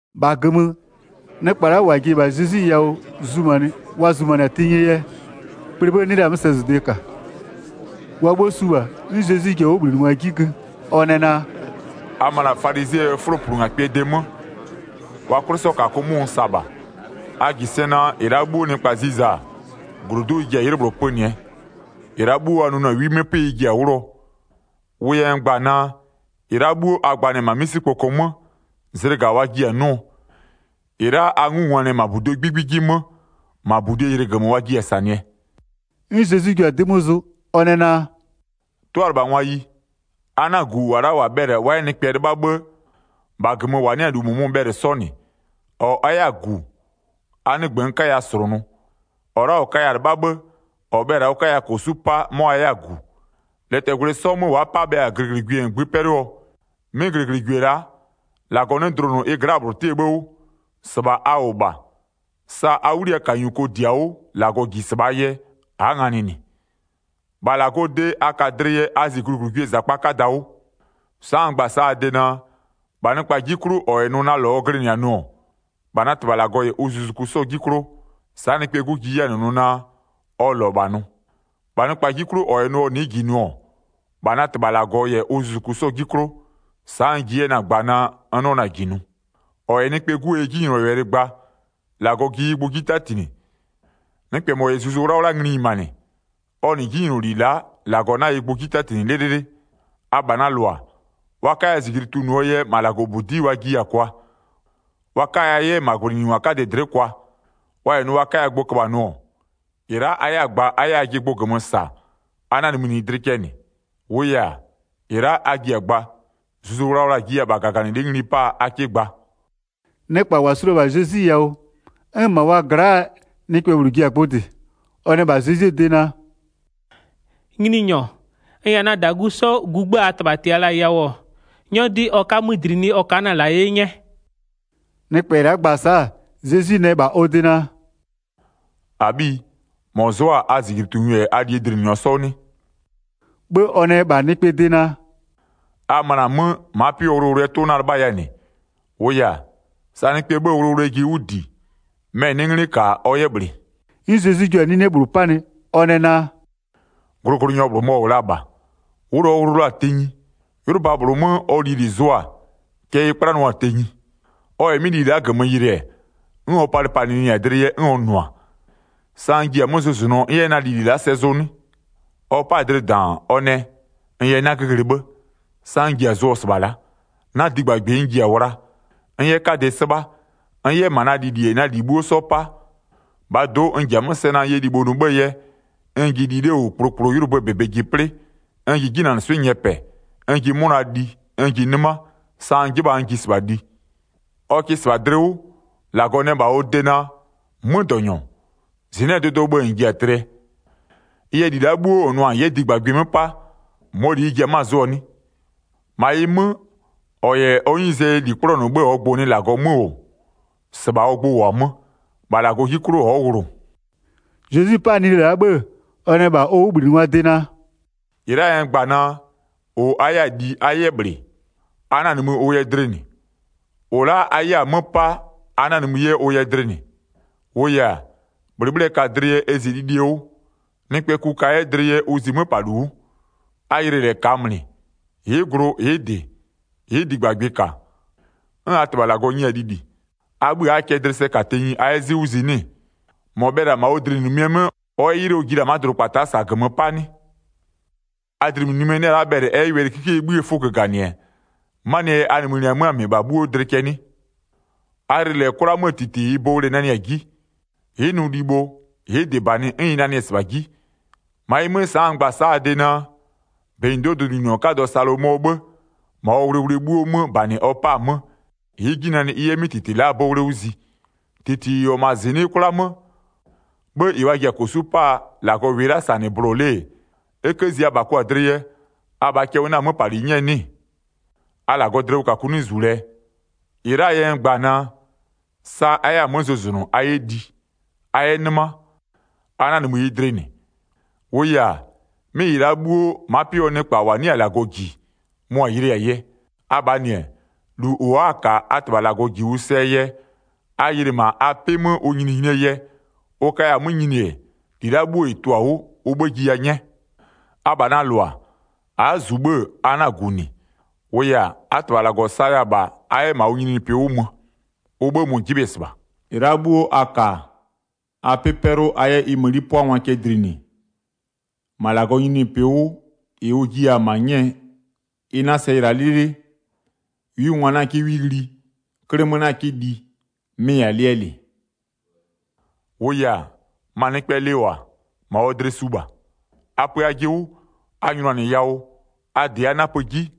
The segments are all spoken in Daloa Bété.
1-Bha -gömö, nɩkpa la'a -wa ji-e -bha Zezwi yawʋ zumanɩ wa zumanɩ-a tenyie yɛ, kplee 'bhë 'nɩ la sɛzʋde -ka. Wa 'bhuo su -bha, 'n Zezwi ji-a ɔ 'wʋbhlinɩngwa 'ji gö, ɔ nɛ naa: “A möna-a falizɩɛ 'fʋloplungakpɩɛ de 'mö, wa 'kwlɩsɔkakʋ 'mʋ n sa -bha. A -ji sɛ naa, -ɩ la'a 'bhuo nɩkpa ziza-a, -glodu'u ɩ ji-a 'ylɩ -bhlʋ pönɩɛ. -Ɩ la'a 'bhuo wa nʋnʋ-a 'wi 'mö 'pɩ ɩ ji-a 'wlʋɔ. Wʋ yɛ n gba-a naa, -ɩ la'a 'bhuo a gbanɩ-ɛ -ma 'misikpoko 'mö, zlɩga wa jiɩ-a 'nʋɔ. -Ɩ la'a a 'ngungwanɩ-ɛ -ma -buduo 'gbigbi 'ji 'mö, -ma -budie ylɩgömö wa jiɩ-a -sanɩɛ.” 'N Zezwi jua-a 'dɩ 'mö zʋ, ɔ nɛ naa: “'Tʋalɩbhangwayi, a 'na-a -gu -wa la'a -wa bhɛlɩ-a wa 'yɛ nɩkpɛ 'lɩbha 'bhë, -bha -gömö -wa 'nɩ-a -lu -mʋmʋ-ʋ bhɛlɩ 'sɔ -nɩ. 5-Ɔ a 'yɛ-a -gu, a 'nɩgbö n 'kaya -slʋnʋ. -Ɔ la'a -ɔ kaya-a 'lɩbha 'bhë, -ɔ bhɛlɩ-a ɔ 'kaya -kosu'u 'pa 'mɔ a 'yɛ-a -gu. Lɛtɛgwlɩ 'sɔ 'mö wa'a 'pa bhe-a -glɩglɩgwie -ngbï 'pɛlʋɔ? 'Mɩ -glɩglɩgwie la'a, -Lagɔ 'nɩ dlʋnʋ ɩ gla'aa -bhlʋ 'tɩɛ 'bhë 'wʋ. 7-Sɩbha a -wʋ -bha. Sa a 'wliyawʋkanyuko -di-a 'wʋ -Lagɔ -ji -sɩbhaa yɛ, a'a nganɩ -nɩ. -Bha -Lagɔɔ de a ka dlɩ yɛ a zi -glɩglɩgwiee -zakpa 'kada 'wʋ. Sa'a n gba-a sa'a a de naa, -bha nɩkpa 'ji 'klʋ -ɔ -yɛ nʋ naa na -lɔ ɔ glɩnɩ-a nʋ-ɔ, -bha na -Tɩbha -Lagɔ -yɛ ʋ zuzuku 'sɔɔ 'ji 'klʋ, sa'a Nɩkpɛɛ 'Gu ji 'yɛ-a -nɩ nʋ naa, ɔ -lɔ -bha nʋ. 9-Bha nɩkpa 'ji 'klʋ -ɔ -yɛ nʋ ɔ nɩ'ɩ -ji nʋ-ɔ, -bha na -Tɩbha -Lagɔ -yɛ ʋ zuzuku 'sɔɔ 'ji 'klʋ, sa'a n ji 'yɛ-ɛ na-a gba naa, n 'nɩɔ na-a -ji nʋ. 10-Ɔ -yɛ Nɩkpɛɛ 'Guo yɛ 'jinylɔwɛlɩ gba, -Lagɔ ji ɩ gbʋ 'ji 'tatinɩ. Nɩkpɛ -mɔ -yɛ Zuzu 'Wlawla ngli nyimanɩ, ɔ -nɩ 'jinyloli la'a, -Lagɔ 'na ɩ gbʋ 'ji 'tatinɩ 'lɩlɩlɩ. Abha na -lʋa, wa 'kaya -zijli tunʋɔ yɛ -ma -Lagɔbudi'i wa jiya-a kwa, wa 'kaya 'yɛ -ma -gwlɩnyiningwa 'kadɩ dlɩ'ɩ kwa. Wa -yɛ nʋ wa 'kaya gbʋ köbha nʋ-ɔ, -ɩ la'a a 'yɛ-a gba a 'yɛ ajɩ gbʋ -gömö -sa, a 'na-a nimïnɩɩ dlɩ cɛ -nɩ. 12-Wʋʋ yɛ-a, -ɩ la'a a ji-a gba, Zuzu Wlawla-a jiya-a -bha -gaganɩlɩ'ɩ ngli 'paa a 'kɩ gba.” Nɩkpa -wa su la-a -bha Zezwi yawʋ, 'n -ma wa gla'aa nɩkpɛ -bhlʋ ji-a gbʋ -dɩ. Ɔ nɛ -bha Zezwie de naa: “Nyininyɔ, n -yɛ na -dagu 'sɔ gugbë -aa -tɩbha -tɩya la-a yawʋ, 'nyɔ 'dɩ ɔ 'ka 'mö -dlinɩ, ɔ ka'a na -nɩ -la 'ye 'nyɛ.” Nɩkpɛ la'a gba-a sa'a, Zezwi nɛ -bha ɔ de naa: “-Abhiyi, a'a -mɔ zʋ'ʋ-a a -zijlitunyɔ -yɛ a -lie dlinɩnyɔ 'sɔ 'wʋ 'nɩ?” 'Bhë ɔ nɛ -bha nɩkpaa de naa: “A möna 'mö, ma'a pɩ 'wʋɔ wʋlʋwʋlʋɛ 'tʋ 'na-a 'lɩbhaya -nɩ. -Wʋʋ yɛ-a, sa nɩkpɛ 'bhëë wʋlʋwʋlʋɛ ji 'wʋ -di, mɛ-ɛ 'nɩ 'nglɩ -ka ɔ 'yɛ -bhlɩ.” 'N Zezwi jua-a 'nine -bhlʋ 'panɩ, ɔ nɛ naa: “Glʋglʋnyɔ -bhlʋ mɔ-ɔ -wʋ la-a -bha, wʋlʋ ɔ wʋlʋ la-a tenyi. 'Ylʋba -bhlʋ 'mö ɔ lili zʋ-a, cɛ ɩ 'kplanɩɔ-a tenyi. Ɔ -yɛ 'mɩ lili la'a -gömö yɩlɩ-ɛ, 'n ɔ palɩpalɩnɩ-a dlɩ yɛ 'n ɔ nʋ-a: Sa n ji-a 'mö zʋzʋnʋɔ n 'yɛ na lili la'a sɛ zʋ 'nɩ? Ɔ 'pa-a dlɩ -daan, ɔ nɛ: N yɛ 'nagö ghlɩ 'bhë. Sa n ji-a zʋɔ -sɩbha la'a. Na -digbagbɩ n ji-a wlaa, n 'yɛ 'kadɩ 'sɩbha, n 'yɛ -ma na lili -yɛ na -li 'bhuo 'sɔ 'pa. 19-Bhaa do'o, n ji-a 'mö sɛ naa n yɛ libho nʋ 'bhëë yɛ, n ji li 'le -wʋ kplokplo 'ylʋböö -bebe ji 'plɩ. N ji 'jinanɩswɩ'ɩ nyɛpɛ, n ji 'mʋna li, n ji 'nɩma, sa n 'jɩbha-a n ji -sɩbha li. Ɔ kɩ -sɩbha dlɩ 'wʋ, -Lagɔ nɛ -bha ɔ de naa: 'Mödɔnyɔ, -zɩnɩ'ɩɛ dʋdʋɔ 'bhë -bha -n -ji-a tlɩɛ. Ɩ yɛ, -li la'a 'bhuo -n nʋ-a -n 'yɛ -digbagbɩ 'mö 'pa, -mɔɔ -li ɩ ji-e 'mö-a zʋɔ 'nɩ? 21-Ma ɩ 'mö, -ɔ -yɛ ɔ 'nyizee yɛ -li 'kplɔnʋ 'bhë -ɔɔ gbʋ-ʋ nɩ -Lagɔ 'mö -wʋ, -sɩbha ɔ gbʋ -wʋ-a 'mö. -Bha -Lagɔɔ 'ji 'klʋ ɔ'ɔ wʋlʋ.” Zezwi 'pa-a 'nine la'a 'bhë, ɔ nɛ -bha ɔ 'wʋbhlinɩngwaa de naa: “-Ɩ la'aa yɛ n gba-a naa: -Ʋ a 'yɛ-a li a 'yɛ -bhlɩ, a 'na-a nimï ʋ yɛ dlɩ -nɩ. -Ʋ a 'yɛ-a 'mö 'pa a 'na-a nimï 'yɛ ʋ yɛ dlɩ -nɩ. 23-Wʋʋ yɛ-a, -bhlɩbhlɩɛ ka dlɩ yɛ ɛ zi lilie 'wʋ, nɩkpɛɛ ku ka 'yɛ dlɩ yɛ ʋ zi 'möpalu 'wʋ. A yɩlɩ -lɛ -kaamlɩ, ɩ'ɩ glʋ ɩ'ɩ -dɩ, ɩ'ɩ -digbagbɩ -ka, 'n a -Tɩbha -Lagɔ nyɩ-a lili. A 'bhï a'aa cɛ dlɩ sɛ -ka tenyi a 'yɛ 'zɩ 'wʋ zi 'nɩ-ɩ? 25-Mɔ bhɛlɩ-a -ma ɔ dlɩnimïnimie 'mö ɔ 'yɛ 'ylɩ ɔ ji la-a ma'a dʋdʋkpata'a -saa -gömö 'pa 'nɩ? A dlɩnimïnimie 'nɩ-ɛ la'a bhɛlɩ ɛ 'yɛ wɛlɩkikie 'bhïë 'fʋ göganɩ-ɛ, 'manɩɛ yɛ a nimïnɩ-ɛ 'mö-a -mɩbha 'bhuo dlɩ cɛ 'nɩ? A yɩlɩ -lɛ -ma 'kwla 'möö -titi -ɩɩ 'bowle nanɩ-a 'ji. Ɩ'ɩ nʋ libho, ɩ'ɩ -dɩ -banɩ 'n ɩ nanɩ-ɛ -sɩbha 'ji. -Ma ɩ 'mö, sa'a n gba-a sa'a a de naa: -Benyido'oo dʋdʋnyininyɔ 'kadɔ Salomɔɔ 'bhë, -ma ɔ wʋlʋwʋlʋɛ 'bhuo 'mö -banɩ ɔ 'pa-a 'mö, ɩ'ɩ 'ji nanɩ ɩ 'yɛ 'mɩ -titi la'aa 'bowle 'wʋ zi. 28-Titi -ɩ -wʋ-ɔ -ma -zɩnɩ'ɩ 'kwla 'mö, 'bhë -ɩ wa ji-a -kosu'u 'paa -Lagɔ -wɩɩ la'a -sa -nɩ bʋlʋa 'le-e, e 'kë zi abha kʋ-a dlɩ yɛ, abhaa cɛ ʋ 'na-a 'möpali 'nyɛɛ 'nɩ-ɩ? A -Lagɔɔ dlɩwʋkakʋ 'nɩ -zu lɛɛ! 29-Ɩ la'aa yɛ n gba-a naa: Sa a 'yɛ-a 'mö zʋzʋnʋ a 'yɛ li, a 'yɛ 'nɩma, a 'na-a nimï ɩ dlɩ -nɩ. 30-Wʋʋ yɛ-a, 'mɩ -ɩ -la 'bhuo, ma'a 'pɩ 'wʋɔ nɩkpa -wa 'nɩ-a -Lagɔ -ji, mʋa-a yɩlɩɩ-a yɛ. Abhaa -nɩ-ɛ, -lu -ʋ a'a-a -ka a -Tɩbha -Lagɔ -ji ʋ sɛɛ yɛ, a yɩlɩ -ma a 'pɩ 'mö ʋ nyininyinie yɛ, ʋ kaya-a 'mö nyini-e, -li la'a 'bhuo -ɩ tʋ-a 'wʋ, ʋ 'bhë jiya 'nyɛ. Abha na -lʋa, a'a -zu 'bhë-ë a 'na-a gu -nɩ. -Wʋʋ yɛ-a, a -Tɩbha -Lagɔ mʋ-ʋ saya-a -bha a 'yɛ -ma ʋ nyininyinipɩ 'wʋ mö. Ʋ 'bhë mʋ-ʋ 'jɩbhɩ-ɛ -sɩbha. 33-Ɩ la'a 'bhuo a ka-a, a 'pɩ 'pɛlʋ a 'yɛ ɩ mëni 'pʋangwa cɛ dlinɩ. -Ma -Lagɔɔ nyininyinipɩ 'wʋ, -ɩ ʋ jiya-a -ma 'nyɛɛ ɩ 'na sɛ yɩla 'lɩlɩlɩ, 'wingwa 'na 'kɩ 'wi ghli, 'klɩmö 'na 'kɩ li. Mɩ-ɩ -yɛ-a lɩɛ -lɩ. 34-Wʋʋ -yɛ-a, ma nɩkpɛ lɩ -wʋ-a, -ma ɔ dlɩ su -bha. A pö ajɩ 'wʋ, a nyʋnanɩ yawʋ, a -dɩ a 'napö 'ji.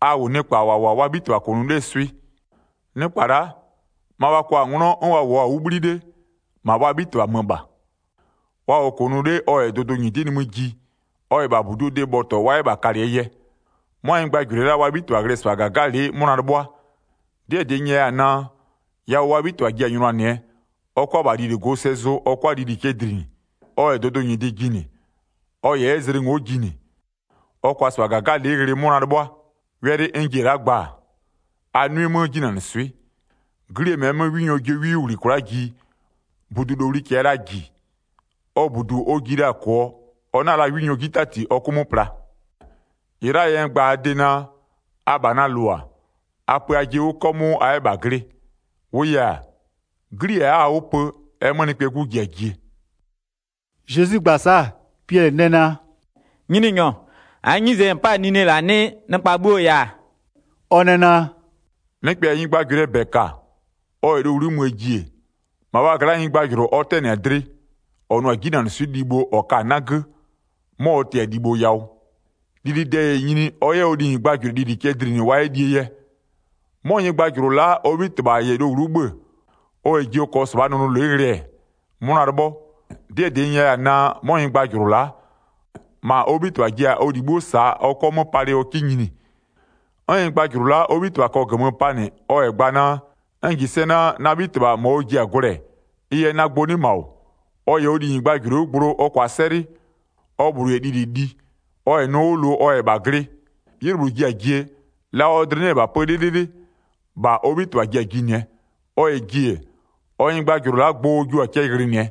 A -wʋ nɩkpa -wa -wʋ-a wa 'bhitɩbha -kʋnʋ 'lee swɩ. Nɩkpa la'a, ma wa kwa-a 'nglɔ 'n wa -wʋɔ-a 'wʋ 'bhli 'le, -ma wa 'bhitɩbha 'mö -bha. Wa -wʋɔ -kʋnʋ 'le ɔ -yɛ dʋdʋnyɩdɩ nimï ji, ɔ -yɛ -bha -buduo de bhɔtɔ wa 'yɛ -bha kalɩɛ yɛ. 'Mʋa nyɩgbajʋlʋɩ la'a wa 'bhitɩbha ghlɩ-ɛ -sɩbha -gagalɩ'ɩ 'mʋna 'lɩbhʋa. 'Dɩɛ -dɩ n nyɛya-a naa, yawʋ wa 'bhitɩbha ji-a nyʋnanɩɛ, ɔ -kʋa -bha lili go sɛ zʋ 'bhë ɔ 'kʋa-a lili cɛ dlinɩ. Ɔ -yɛ dʋdʋ -nyɩdɩ jinɩ, ɔ -yɛ 'yɛ zlɩ ngo'o jinɩ, ɔ -kʋa -sɩbha -gagalɩ'ɩ ghlɩ 'mʋna 'lɩbhʋa. Wɛlɩ n ji-e la'a gbaa, a 'nʋɩ 'mö 'jinanɩswɩ'ɩ. 'Glie -mɛɛ 'mö 'winyɔ jio 'wi 'wʋ -ghli kwla'a ji, -budulowli -kɛɛ la -ji, ɔ -budu ɔ ji la-a -kʋɔ ɔ 'na la 'winyɔ 'ji 'tati ɔ 'kʋ 'mö pla. 40-Ɩ la'aa yɛ n gba-a a de naa: Abha na -lʋa, a pö ajɩ 'wʋ 'kɔmʋʋ a 'yɛ -bha glɩ. -Wʋʋ yɛ-a, 'glie a'a-a 'wʋ pö, ɛ 'mö Nɩkpɛɛ 'Gu ji-a jie.” Zezwi gba-a sa'a, Piɛlɩ nɛ naa: “Nyininyɔ, -aa 'nyizee yɛ -n 'pa-a 'nine -la 'nɩɩ? Nɩkpa 'bhuoo yɛ-a?” Ɔ nɛ naa: “Nɩkpɛ -yɛ nyɩgbajʋlʋɩɛ -bɛ -ka, ɔ -yɛ lowlu'u möö ji-e, -ma wa gla'aa nyɩgbajʋlʋ -ɔ ɔ 'tɛnɩ-a dlɩ, -ɔ nʋ-a 'jinanɩswɩ'ɩ libho -ɔ ka-a 'nagö, 'mɔ ɔ tɩ-a ɔ libho yawʋ. Lilide -yɛ nyini, ɔ 'yɛ ɔ linyɩgbajʋlʋɩ lili cɛ dlinɩ wa 'yɛ lie yɛ. 'Mɔ nyɩgbajʋlʋ la'a ɔ 'bhitɩbha -yɛ lowlu'u 'bhö-ö, ɔ -yɛ ji ɔ -kɔɔ -sɩbhaa nʋnʋlɩ'ɩ ghlɩ-ɛ, 'mʋna 'lɩbhɔ. 'Dɩɛ -dɩ n nyɛya-a naa, 'mɔ nyɩgbajʋlʋ la'a, -ma ɔ 'bhitɩbha ji-a ɔ -li 'bhuo -saa ɔ 'kɔ 'mö palɩ ɔ 'kɩ nyini. 'N nyɩgbajʋlʋ la'a ɔ 'bhitɩbha -kɔɔ -gömö panɩ ɔ -yɛ gba naa: N -ji sɛ naa, na 'bhitɩbha -ma ɔ ji-a gwlɛɛ ɩ yɛ na gbʋ 'nɩ -ma -wʋ. Ɔ -yɛ ɔ linyɩgbajʋlʋɩ 'wʋ gblo ɔ -kʋa 'sɛlɩ, ɔ -bhlʋ -yɛ lili li, ɔ -yɛ nʋ 'wʋ lʋ ɔ -yɛ -bha glɩ, 'ylɩ -bhlʋ ji-a jie, la ɔ dlɩ 'nɩ-ɛ -bha pö 'lɩlɩlɩ, -bha ɔ 'bhitɩbha ji-a jinɩɛ. Ɔ -yɛ ji-e, ɔ nyɩgbajʋlʋ la'a gbʋ ɔ jio-a cɛ ghlɩnɩɛ.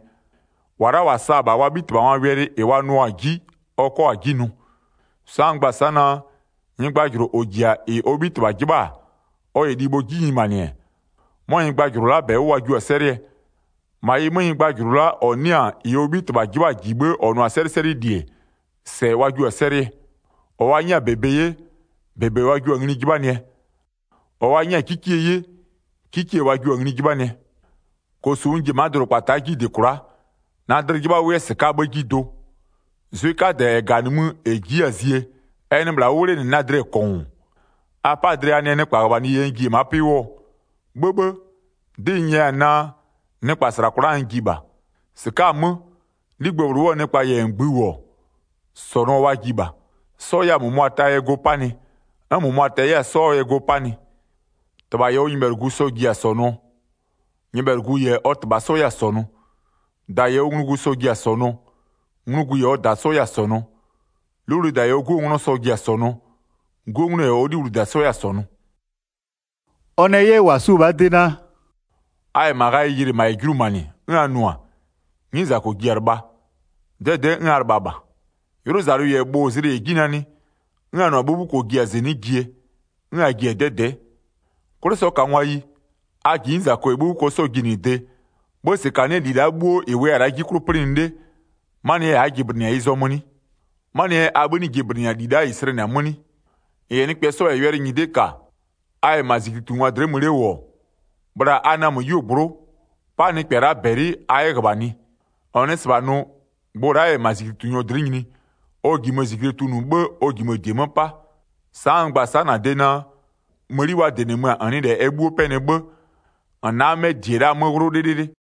-Wa la'a -wa sa-a -bha wa 'bhitɩbhangwaa wɛlɩ -ɩ wa nʋʋa-a 'ji ɔ 'kɔ-a 'ji nʋ. Sa'a n gba-a sa'a naa: Nyɩgbajʋlʋ -ɔ -ji-a -ɩ ɔ 'bhitɩbha 'jɩbha-a, ɔ -yɛ libho 'ji nyimanɩ, 'mɔ nyɩgbajʋlʋ la'a -bɛ 'wʋ wa jio-a 'sɛlɩɛ. Ma ɩ 'mö, nyɩgbajʋlʋ la'a -ɔ 'nɩ-a -ɩ ɔ 'bhitɩbha 'jɩbha-a -ji 'bhë -ɔ nʋ-a 'sɛlɩsɛlɩli-e, -sɛ wa jio-a 'sɛlɩɛ. -Ɔ wa 'nyɛ-a -bebe 'ye, -bebe wa jio-a ngli 'jɩbhanɩɛ. -Ɔ wa 'nyɛ-a 'kikie 'ye, 'kikie wa jio-a ngli 'jɩbhanɩɛ. -Ɩɩ yɛ Zezwi ji-a 49-Kosu n ji-e ma'a dʋdʋkpata'a 'ji -dɩ kwla'a, na dlɩ 'jɩbha ʋ 'yɛ -sɩka'aa 'bhë 'ji do. Zwɩ 'kadɛ -ɛ -ga-a nimï, -ɛ ji'i-a zie, ɛ nɩ -bhla 'wʋ 'wlenɩ na dlɩ-ɛ -kɔngʋʋ. A 'pa-a dlɩ a nɛ nɩkpaa -ghöbhanɩ yɛ n ji-e ma'a 'pɩ 'wʋɔ? 'Bhëbhë, 'dɩ n nyɛya-a naa, nɩkpa -sla kwla'a n ji -bha. 52-Sɩka'a-a 'mö, 'ligbë -bhlʋ 'wʋɔ nɩkpa -yɛ -ngbï -wʋ-ɔ, -sɔnʋɔ wa ji -bha, 'sɔ 'yɛ-a -mʋmʋa taa yɛ go 'panɩ, 'n -mʋabha ta 'yɛ-a 'sɔɔ yɛ go 'panɩ. 53-Tɩbha -yɛ ɔ nyɩbhɛlʋgu sɔ-ɔ ji-a -sɔnʋɔ, nyɩbhɛlʋgu -yɛ ɔ -tɩbha 'sɔ 'yɛ-a -sɔnʋ. -Da -yɛ ɔ nglugu sɔ-ɔ ji-a -sɔnʋɔ, nglugu -yɛ ɔ -da 'sɔ 'yɛ-a -sɔnʋ. 'Luwlida -yɛ ɔ 'guo nglɔ sɔ-ɔ ji-a -sɔnʋɔ, 'guo nglɔ -yɛ ɔ 'luwlida 'sɔ 'yɛ-a -sɔnʋ.” Ɔ nɛ 'yɛ -wa suo-o -bhaa de naa: “A -yɛ -ma ghayɩ yɩlɩ, -ma -yɛ julumanɩ, 'n a nʋ-a: 'Nyizako ji-a lɩbha, 'dɛdɛ'ɛ 'n a lɩbha -bha. 'Ylʋzalʋ -yɛ bhʋ-ʋ zlɩ -yɛ 'ji nanɩ, 'n a nʋ-a 'bhubhuko-o ji-a -zɩnɩ'ɩ jie, 'n a ji-a 'dɛdɛ'ɛ. 'Kwlɩsɔkangwayi, a -ji 'nyizako -yɛ 'bhubhuko 'sɔɔ jinɩde, 'bhë -sɩkanɩɛ -li la'a bhuo -ɩ -wʋya-a 'ji 'klʋ 'plɩnɩ 'le, 'manɩɛ yɛ a'a jɩblɩnɩ-a ɩ zɔmö 'nɩ? 'Manɩɛ yɛ a 'bhï 'nɩ jɩblɩnɩ-a -li la'a -ɩ slɛnɩ-a 'mö 'nɩ? 58-N -yɛ nɩkpɛ 'sɔ -yɛ wɛlɩ nyɩdɩ -ka, a -yɛ -ma -zijlitungwa dlɩ'ɩ mö 'le -wʋ-ɔ, bhla a namö 'yuogblʋ'ʋ, 'pa nɩkpɛ la'a -bɛlɩ a 'yɛ -ghöbhanɩ. -N nɩ -sɩbha nʋ, gbʋ la'a -yɛ -ma -zijlitunyɔ dlɩ'ɩ nyini, ɔ -jimö-ö -zijle tunʋ 'bhë, ɔ -jimö-ö -die 'mö 'pa. Sa'a n gba-a sa'a -na de naa: Mëni wa -dɩnɩmö-a -n nɩ -lɛ ɛ 'bhuo 'pɛnɩ 'bhë, -n 'na 'mɛ -die la'a 'mö 'wlʋ 'lɩlɩlɩ.”